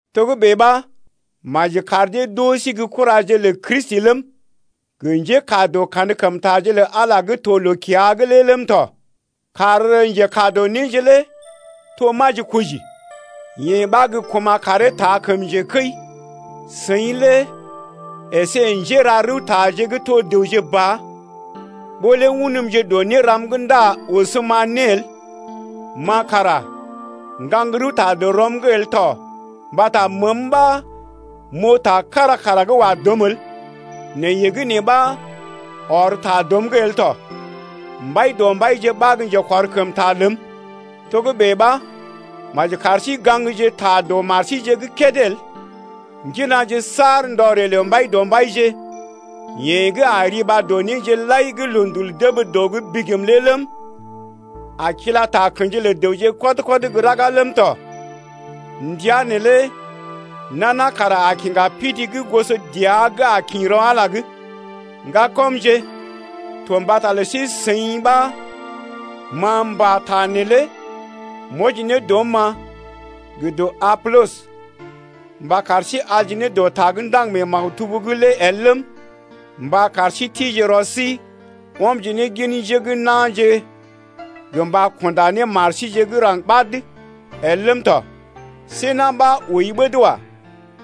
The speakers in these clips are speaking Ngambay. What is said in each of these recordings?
Togə́bè ɓa maji kar dee d’oo sí gə́ kuraje lə Kristi ləm, gə njékaa dɔ kankəmtaje lə Ala gə́ to loo-kiya’g lé ləm tɔ. Kar njekaa dɔ néje lé to majikoji, yee ɓa gə́ kuma̰ karee taa kəm njekəi. Seḭ lé əsé njéra-rəwtaje gə́ to dəwje ba, ɓó lé unmje dɔ néram’g ndá ɔsm-ma né el. Ma kara m’gaŋg rəwta dɔ rɔm’g el tɔ mbata məəm ɓa m’oo ta kára kara gə́ wa dɔm el, nɛ yee gə́ nee ɓa ɔr ta dɔm’g el tɔ. Mbaidɔmbaije ɓa gə́ njekɔrkəmta ləm. Togə́bè ɓa maji kar sí gaŋgje ta dɔ mar síje’g kédé el. Ŋginaje saar ndɔ ree lə Mbaidɔmbaije, yeḛ gə́ a riba dɔ néje lai gə́ loondul dəb dɔ’g bigim lé ləm, a kila takə̰ji lə dəwje kɔd-kɔd gə́ raga ləm tɔ. Ndəa neelé nana kara a kiŋga pidi gə́ goso dəa gə́ a kḭ rɔ Ala’g ya. Ŋgakɔmje, to mbata lə sí-seḭ ɓa ma m’pata neelé m’wɔji ne dɔm-ma gə dɔ Apolɔs mba kar sí alje ne dɔ ta gə́ ndaŋg mee maktub’g lé el ləm, mba kar sí tije rɔ sí ɔmje ne gin njé gə́ na̰je gə mba kunda ne mar síje gə́ raŋg ɓad el ləm tɔ. See na̰ ɓa ooi ɓəd wa.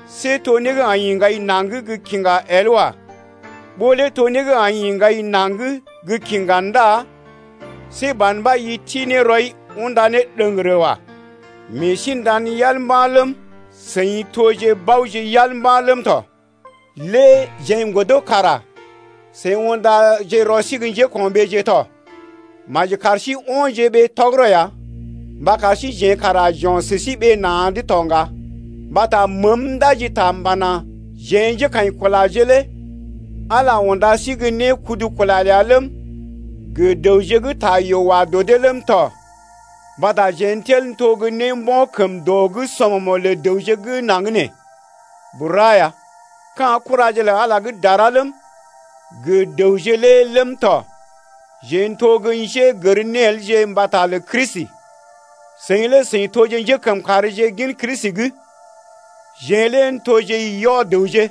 See to né gə́ aḭ ḭgai naŋg gə́ kiŋga el wa. Ɓó lé to né gə́ aḭ ḭgai naŋg gə́ kiŋga ndá see ban ɓa i ti ne rɔi unda ne ɗəŋgərə wa. Meḛ sí nda̰ yal mba̰ ləm, seḭ toje baoje yal mba̰ ləm tɔ. Lé jeḛ n’godo kara seḭ undaje rɔ sí gə́ njéko̰ɓeeje tɔ. Maji kar sí o̰je ɓee tɔgərɔ ya mba kar síjeḛ kara j’o̰ sə sí ɓee na̰’d to ŋga. Mbata məəm ndaji ta m’pana: Jeḛ njékaḭkulaje lé Ala unda sí gə́ né kudu kula ləa ləm, gə dəwje gə́ ta yoo wa dɔ dee ləm tɔ mbata jeḛ n’tel n’to gə́ né mbo̰ kəm dɔ’g sɔmɔmo̰ lə dəwje gə́ naŋg nee bura ya, ka̰ kuraje lə Ala gə́ dara ləm, gə dəwje lé ləm tɔ. Jeḛ n’to gə́ njénégərelje mbata lə Kristi, seḭ lé seḭ toje njékəmkàrje gin Kristi’g. Jeḛ lé n’toje yɔ-dəwje,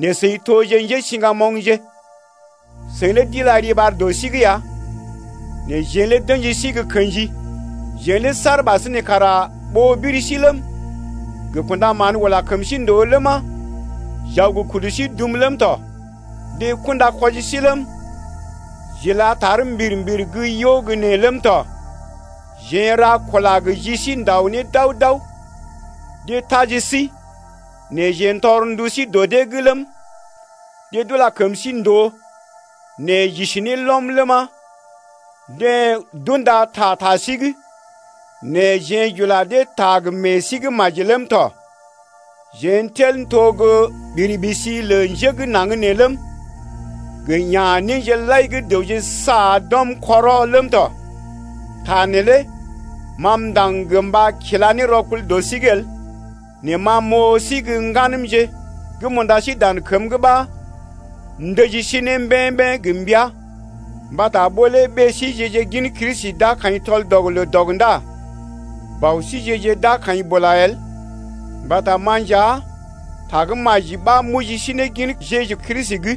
nɛ seḭ toje njésiŋgamoŋje. Seḭ lé d’ila riɓar dɔ sí’g ya nɛ jeḛ lé d’ə̰ji sí gə kḛji! Jeḛ lé saar ɓasinè kara ɓoo biri sí ləm, gə kṵdaman ula kəm sí ndòo ləma, j’aw gə kudu sí dum ləm tɔ: deḛ kunda kwɔji sí ləm, j’ila tar mbir-mbir gə́ yo gə nee ləm tɔ. Jeḛ n’ra kula gə ji sí n’dao ne dao-dao, deḛ taji sí nɛ jeḛ tɔr ndu sí dɔ dee’g ləm, deḛ d’ula kəm sí ndòo nɛ j’isi ne lɔm ləma 3deḛ d’unda ta ta sí’g nɛ jeḛ j’ula dee ta gə meḛ sí gə́ maji ləm tɔ. Jeḛ n’tel n’to gə́ ɓiri-ɓisi lə njé gə́ naŋg nee ləm, gə ya̰-néje lai gə́ dəwje saa d’ɔm kɔrɔ ləm tɔ. Ta neelé ma m’ndaŋg gə mba kila ne rɔkul dɔ sí’g el: nɛ ma m’oo sí gə́ ŋganəmje gə́ m’unda sí dan kəm’g ɓa m’ndəji sí ne mbeḛ-mbeḛ gə mbəa. Mbata ɓó lé ɓée síje-je gin Kristi d’a kaḭ tɔl-dɔg-loo-dɔg ndá bɔ síje-je d’a kaḭ bula el mbata ma nja Tagə́maji ɓa m’oji sí ne gin Jeju Kristi’g.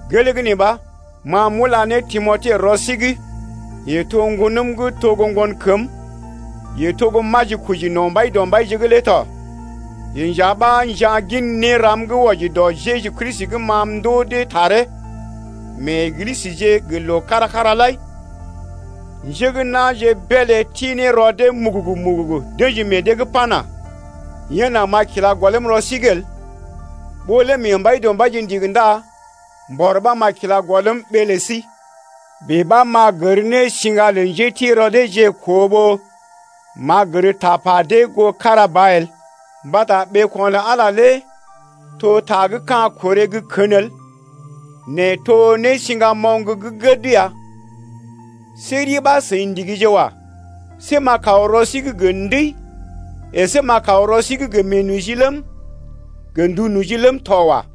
Gelee gə́ nee ɓa ma m’ula ne Timote rɔ sí’g, yeḛ to ŋgonəm gə́ to gə́ ŋgonkəm, yeḛ to gə́ majikoji no̰ Mbaidɔmbaije’g lé tɔ. Yeḛ nja ɓa a nja̰ gin néram gə́ wɔji dɔ Jeju Kristi gə́ ma m’ndoo dee taree mee Eglisəje gə loo kára-kára lai lé. Njé gə́ na̰je beelé ti ne rɔ dee mugugu-mugugu d’ə̰ji meḛ dee’g pana: Yen nà ma m’a kila gɔlm rɔ sí’g el. Ɓó lé mee Mbaidɔmbaije ndigi ndá mbɔr ɓa m’a kila gɔlm ɓee lə sí. Bèe ɓa m’a gər ne siŋga lə njéti rɔ deeje koo ɓó m’a gər tapa dee goo kára ba el. Mbata ɓeeko̰ lə Ala lé to ta gə́ ka̰ korè gə́ kən el nɛ to nésiŋgamoŋ gə́ gəd ya. See ri ɓa seḭ ndigije wa. See m’a kaw rɔ sí’g gə ndəi əsé m’a kaw rɔ sí’g gə meenoji ləm, gə ndu noji ləm tɔ wa.